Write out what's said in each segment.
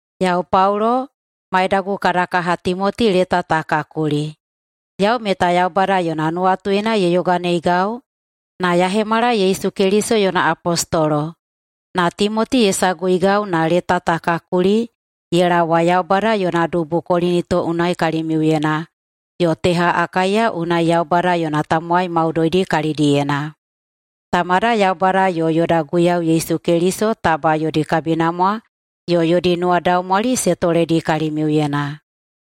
Yau Paulo, maidagu kada kaha Timoti leta ta ka kuli. Yau meta Yaubada yona nuwatuyena ye yoganeigau na ya hemala Yesu Keliso yona apostolo. Na Timoti ye saguigau na leta ta ka kuli ye laowa Yaubada yona dubu Kolinito unai kalimiuyena yo teha Akaiya unai Yaubada yona tamowai maudoidi kalidiyena. Tamada Yaubada yo yoda Guiyau Yesu Keliso taba yodi kabinamwa yo yodi nuwadaumwali se toledi kalimiuyena.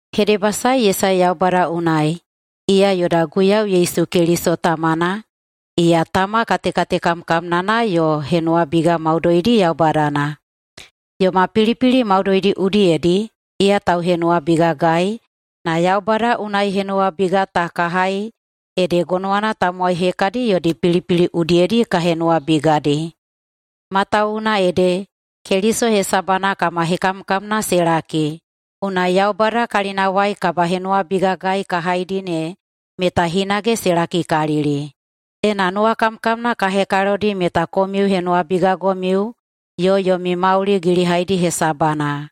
Hedebasae ye sae Yaubada unai, iya yoda Guiyau Yesu Keliso Tamana, iya Tama katekatekamkamnana yo henuwabiga maudoidi Yaubadana. Yoma pilipili maudoidi udiyedi iya tauhenuwabigagai na Yaubada unai henuwabiga ta ka hai ede gonowana tamowai hekadi yodi pilipili udiyedi ka henuwabigadi. Matawuwuna ede, Keliso hesabana kama hekamkamna se laki, unai Yaubada kalinawai kabahenuwabigagai ka haidi ne meta hinage se lakikalili. Ena nuwakamkamna ka hekalodi meta komiu henuwabigagomiu yo yomi mauli gilihaidi hesabana.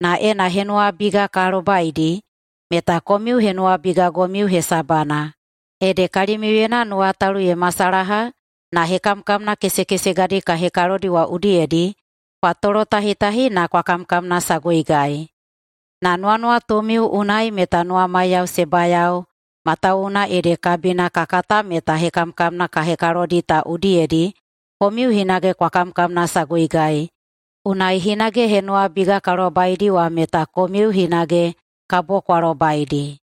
Na ena henuwabiga ka lobaidi, meta komiu henuwabigagomiu hesabana, ede kalimiuyena nuwatalu ye hemasalaha na hekamkamna kesekesegadi ka hekalodi wa udiyedi kwa tolotahitahi na kwa kamkamnasaguigai. Na nuwanuwatumiu unai meta nuwamaiyao se bayao matawuwuna ede kabina ka kata meta hekamkamna ka hekalodi ta udiyedi komiu hinage kwa kamkamnasaguigai, unai hinage henuwabiga ka lobaidi wa meta komiu hinage kabo kwa lobaidi.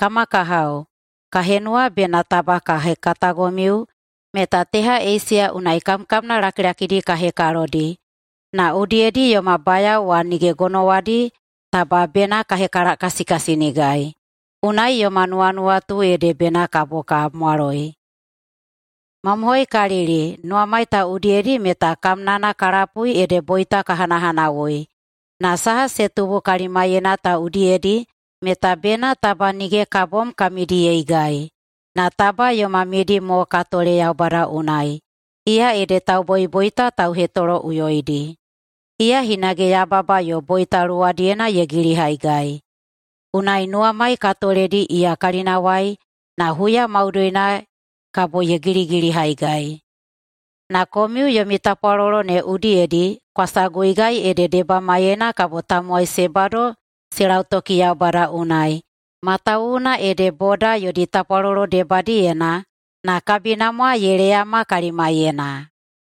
Kama kahao, ka henuwa bena taba ka hekatagomiu meta teha Eisiya unai kamkamna lakilakidi ka hekalodi, na udiyedi yoma bayao wa nige gonowadi taba bena ka hekalakasikasinigai, unai yoma nuwanuwatu ede bena kabo ka mwaloi. Mamohoikalili, nuwamai ta udiyedi meta kamnana ka lapui ede boita ka hanahanawui. Na saha se tubu kalimaiyena ta udiyedi meta bena taba nige ka bom ka midiyeigai, na taba yoma midi mo ka tole Yaubada unai, iya ede tauboiboita tauhetoloꞌuyoidi. Iya hinage yababa yo boita luwadiyedi ye gilihaigai. Unai nuwamai ka toledi iya kalinawai na huya maudoina kabo ye giligilihaigai. Na komiu yomi tapwalolo ne udiyedi kwa saguigai ede debamaiyena kabo tamowai se bado se lautoki Yaubada unai, matawuwuna ede boda yodi tapwalolo debadiyena na kabinamwa ye leyama kalimaiyena.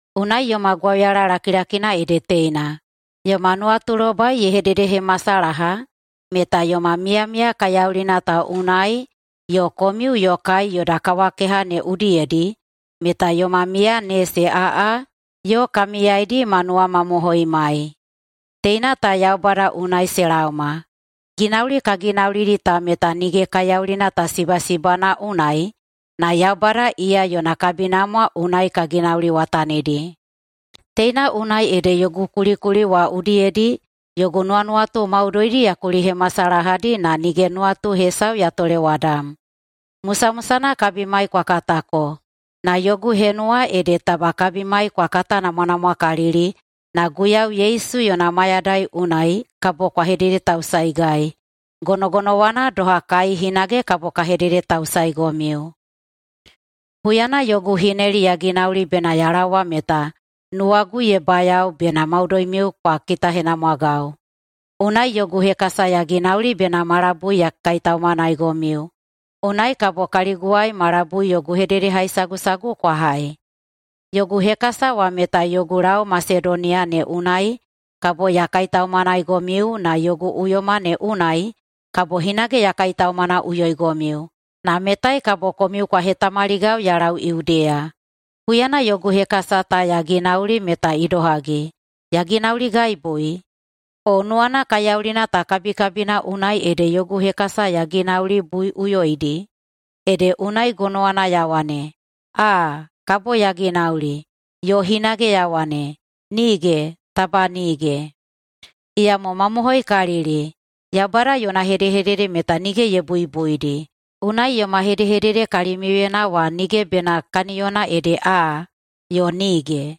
Unai yoma gwauyala lakilakina ede teina: Yoma nuwatulobai ye hededehemasalaha meta yoma miyamiya kaiyaulina ta unai yo komiu yo kai yoda kawakeha ne udiyedi meta yoma miya ne se aꞌa yo ka miyaidi ma nuwamamohoimai. Teina ta Yaubada unai se laoma. Ginauli ka ginaulidi ta meta nige kaiyaulina ta sibasibana unai na Yaubada iya yona kabinamwa unai ka ginauliwatanidi. Teina unai ede yogu kulikuli wa udiyedi yogu nuwanuwatu maudoidi ya kulihemasalahadi na nige nuwatu hesau ya tolewadam. Musamusana kabimai kwa katako, na yogu henuwa ede taba kabimai kwa katanamwanamwakalili na Guiyau Yesu yona mayadai unai kabo kwa hededetausaeigai, gonogonowana doha kai hinage kabo ka hededetausaeigomiu. [Huyana yogu hineli ya ginauli bena ya laowa meta] nuwagu ye bayao bena maudoimiu kwa kitahenamwagau. Unai yogu hekasa ya ginauli bena ma labui ya kaitaumanaigomiu, unai kabo kaliguwai ma labui yogu hededehaisagusagu kwa hai. Yogu hekasa wa meta yogu lau Masedoniya ne unai kabo ya kaitaumanaigomiu na yogu uyoma ne unai kabo hinage ya kaitaumanaꞌuyoigomiu, na metai kabo komiu kwa hetamaligau ya lau Yudeya. Huyana yogu hekasa ta ya ginauli meta idohagi, ya ginauligaibui? O nuwana kaiyaulina ta kabikabina unai ede yogu hekasa ya ginaulibuiꞌuyoidi, ede unai gonowana ya wane, “Aa, kabo ya ginauli!” Yo hinage ya wane, “Nige, taba nige!” Iyamo mamohoikalili: Yaubada yona hedehedede meta nige ye buibuidi. Unai yoma hedehedede kalimiuyena wa nige bena kaniyona ede “Aa” yo “nige”.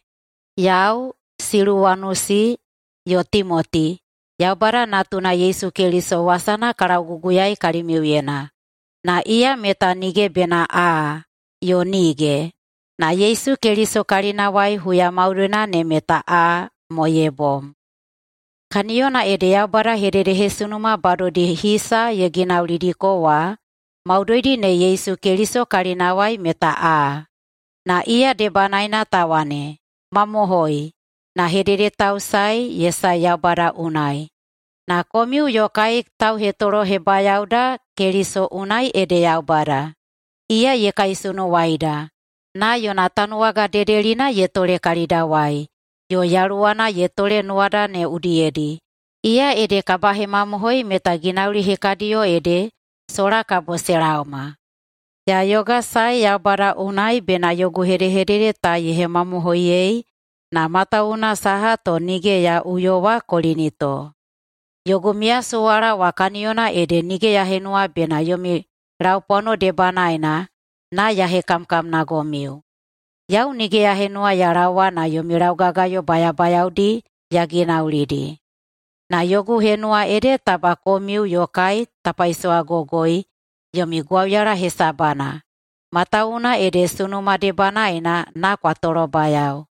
Yau, Siluwanusi yo Timoti Yaubada Natuna Yesu Keliso wasana ka lauguguyaei kalimiuyena, na iya meta nige bena “Aa!” yo “Nige!”, na Yesu Keliso kalinawai huya maudoina ne meta “Aa!” mo ye bom. Kaniyona ede Yaubada hededehesunuma badodi hisa ye ginaulidiko wa, maudoidi ne Yesu Keliso kalinawai meta “Aa!” Na iya debanaena ta wane, “Mamohoi!”, na hededetausae ye sae Yaubada unai. Na komiu yo kai tauhetolohebayaoda Keliso unai ede Yaubada. Iya ye kaisunuwaida na yona tanuwaga dedelina ye tole kalidawai, yo Yaluwana ye tole nuwada ne udiyedi, iya ede kabahemamohoi meta ginauli hekadiyo ede sola kabo se laoma. Ya yogasae Yaubada unai bena yogu hedehedede ta ye hemamohoiyei na matawuwuna saha to nige ya uyowa Kolinito. Yogu miyasuwala wa kaniyona ede nige ya henuwa bena yomi laupwano debanaena na ya hekamkamnagomiu. Yau nige ya henuwa ya laowa na yomi laugagayo bayabayaodi ya ginaulidi. Na yogu henuwa ede taba komiu yo kai ta paisowagogoi yomi gwauyala hesabana, matawuwuna ede sunuma debanaena na kwa tolobayao.